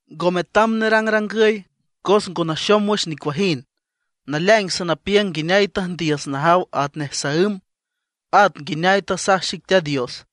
Ngo metam nerangrangüy cos ngo naxom wüx nicuajind. Naleaing sanapiüng nguineay tüjndiüs najaw atnej saǘm, at nguineay tasaj xic Teat Dios.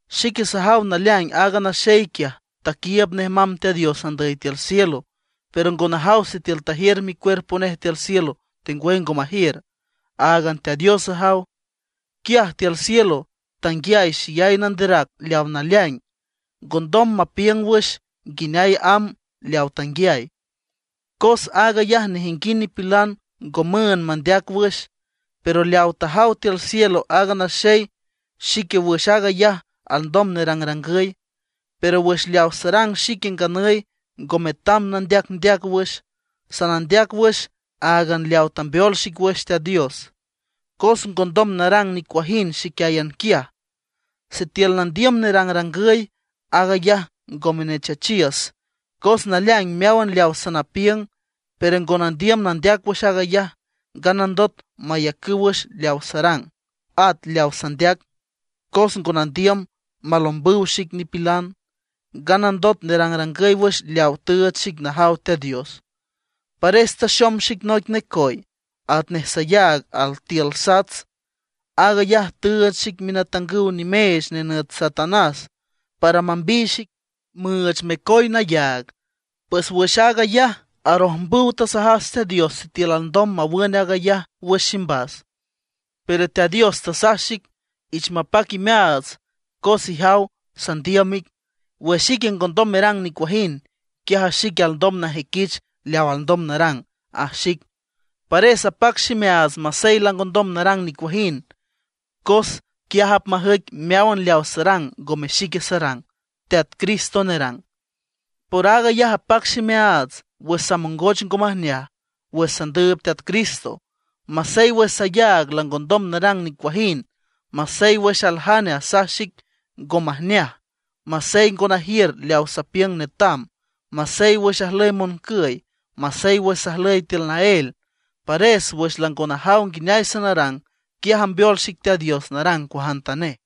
Xique sajaw naleaing aaga naxey quiaj taquiiüb nej mamb Teat Dios andüy tiül cielo, pero ngo najaw sitiül tajiür micuerpo nej tiül cielo, tengwüy ngo majiür, áagan Teat Dios ajaw. Quiaj tiül cielo tanguiay xeyay nanderac leaw naleaing, ngondom mapiüng wüx nguineay amb leaw tanguiay, cos aag ayaj nejinguind nipilan ngo müünd mandeac wüx. Pero leaw tajaw tiül cielo aaga naxey, xique wüx aag ayaj alndom nerangrangüy. Pero wüx leaw sarang xique nganüy ngo metam nandeacndeac wüx. Sanandeac wüx áagan leaw tambeol xic wüx Teat Dios, cos ngondom narang nicuajind xiquiáyan quiaj. Sitiül nandiüm nerangrangüy, aag ayaj ngome nechachiüs, cos naleaing meáwan leaw sanapiüng. Pero ngo nandiüm nandeac wüx aag ayaj, nganandot mayacüw wüx leaw sarang, at leaw sandeac, cos ngo nandiüm malombüw xic nipilan. Nganandot nerangrangüy wüx leaw tüüch xic najaw Teat Dios, pares taxom xic noic necoy, atnej sayaag altiül sats. Aag ayaj tüüch xic minatangüw nimeech nenüt Satanás para mambiy xic, müüch mecoy nayaag. Pues wüx aag ayaj, arojmbüw tasajas Teat Dios sitiül alndom mawün aag ayaj wüx ximbas. Pero Teat Dios tasaj xic: “Ich mapac imeaats cos ijaw sandiüm ic. Wüx ique ngondom merang nicuajind, quiaj xique alndom najüiquich leaw alndom narang”, aj xic. Pares apac ximeaats masey langondom narang nicuajind, cos quiaj apmajüic meáwan leaw sarang ngome xique sarang, Teat Cristo nerang. Por aag ayaj apac ximeaats wüx samongoch ngo majneaj wüx sandüüb Teat Cristo, masey wüx sayaag langondom narang nicuajind, masey wüx aljane asaj xic ngo majneaj, masey ngo najiür leaw sapiüng netam, masey wüx ajlüy moncüy, masey wüx sajlüy tiül naél. Pares wüx lango najaw nguineay sanarang, quiaj ambeol xic Teat Dios narang cuajantanej.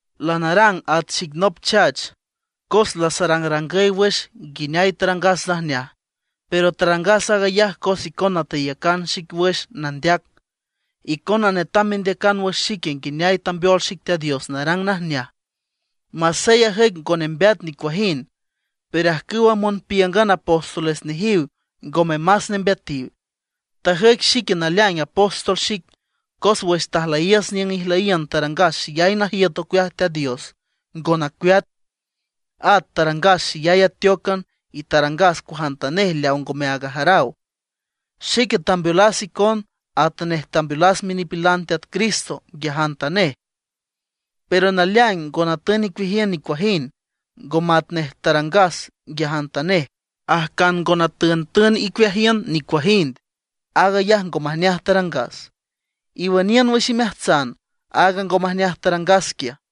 Lanarang at xic nop chach, cos lasarangrangüy wüx nguineay tarangas najneaj, pero tarangas aag ayaj cos icona teyacan xic wüx nandeac. Icona netam mendeacan wüx xique nguineay tambeol xic Teat Dios narang najneaj. Masey ajüic ngo nembeat nicuajind, pero ajcüwa monpíüngan apóstoles nejiw ngome más nembeatiw. Tajüic xique naleaing apóstol xic, cos wüx tajlüyiüs niüng ijlüyiün tarangas xeyay najiüt ocueaj Teat Dios, ngo nacueat. At tarangas xeyay ateócan y tarangas cuajantanej leaw ngome aag ajaraw. Xique tambeolas icon atanej tambeolas minipilan Teat Cristo nguiajantanej, pero naleaing ngo natün icueajiün nicuajind, ngo matnej tarangas nguiajantanej. Ajcan ngo natüntün icueajiün nicuajind, aag ayaj ngo majneaj tarangas. Iwüniün wüx imeajtsan aaga ngo majneaj tarangas quiaj.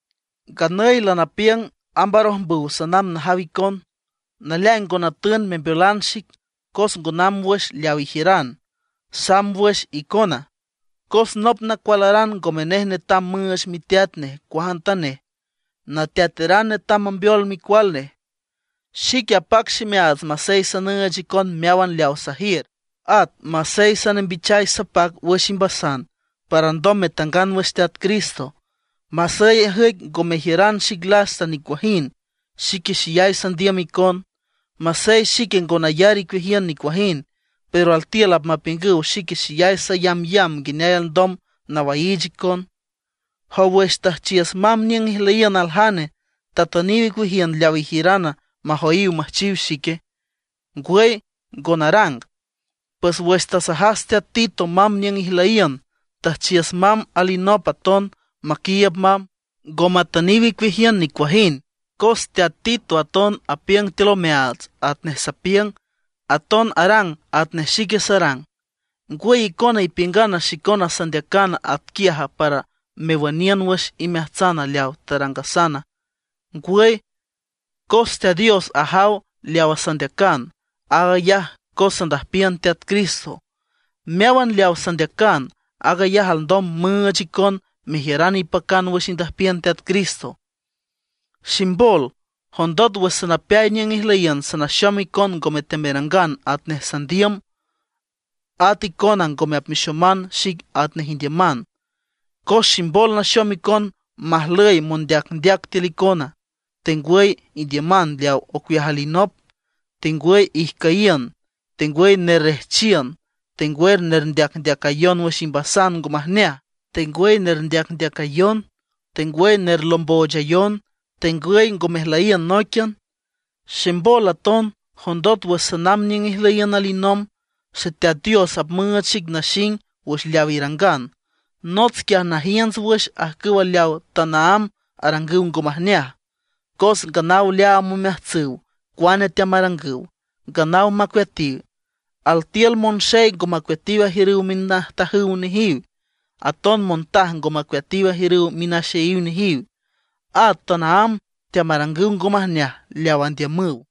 Nganüy lanapiüng amb arojmbüw sanamb najaw icon. Naleaing ngo natün membeolan xic, cos ngo namb wüx leaw ijiüran, samb wüx icona. Cos nop nacualaran ngome nej netam müüch miteat nej cuajantanej; nateataran netam mambeol micual nej. Xique apac ximeaats masey sanüüch icon meáwan leaw sajiür, at masey sanembichay sapac wüx imbasan para alndom metangan wüx Teat Cristo. Masey ajüic ngo mejiüran xic lasta nicuajind, xique xeyay sandiüm icon. Masey xique ngo nayar icueajiün nicuajind, pero altiül apmapiüngüw xique xeyay sayambyamb nguineay alndom nawaiich icon. ¿Jow, wüx tüjchiüs mamb niüng ijlüyiün aljane, tatüniw icueajiün leaw ijiürana, majoyiw müjchiw xique? ¡Ngwüy, ngo narang! Pues wüx tasajas teat Tito mamb niüng ijlüyiün, tüjchiüs mamb alinop aton maquiiüb mamb. Ngo matüniw icueajiün nicuajind, cos teat Tito aton apiüng tiül omeaats atnej sapiüng, aton arang atnej xique sarang. ¿Ngwüy icona ipiüngan xicona sandeacan atquiaja para mewüniün wüx imeajtsan leawa tarangasana? Ngwüy, cos Teat Dios ajaw leaw sandeacan, aag ayaj cos sandüjpiün Teat Cristo. Meáwan leawa sandeacan, aag ayaj alndom müüch icon mejiüran ipacan wüx indüjpiün Teat Cristo. Ximbol, jondot wüx sanapeay niüng ijlüyiün sanaxom icon ngome teamerangan atnej sandiüm; at icona ngome apmexoman xic atnej indiüman. Cos ximbol naxom icon majlüy mondeacndeac tiül icona, tengwüy indiüman leaw ocueaj alinop, tengwüy ijcüyiün, tengwüy nerrejchiün, tengwüy nerndeacayon wüx imbasan ngo majneaj, tengwüy nerndeacndeacayon, tengwüy nerlomboochayon, tengwüy ngo mejlüyiün nóiquian. Ximbol aton, jondot wüx sanamb niüng ijlüyiün alinomb, Xeteat Dios apmüüch xic naxing wüx leaw irangan. Nots quiaj najiünts wüx ajcüw leaw tanaámb arangüw ngo majneaj, cos nganaw leaam omeajtsüw cuane teamarangüw, nganaw macueatiw. Altiül monxey ngo macueatiw ajiürüw minajtajüw nejiw, aton montaj ngo macueatiw ajiürüw minaxeyiw nejiw, at tanaámb teamarangüw ngo majneaj leaw andiümüw.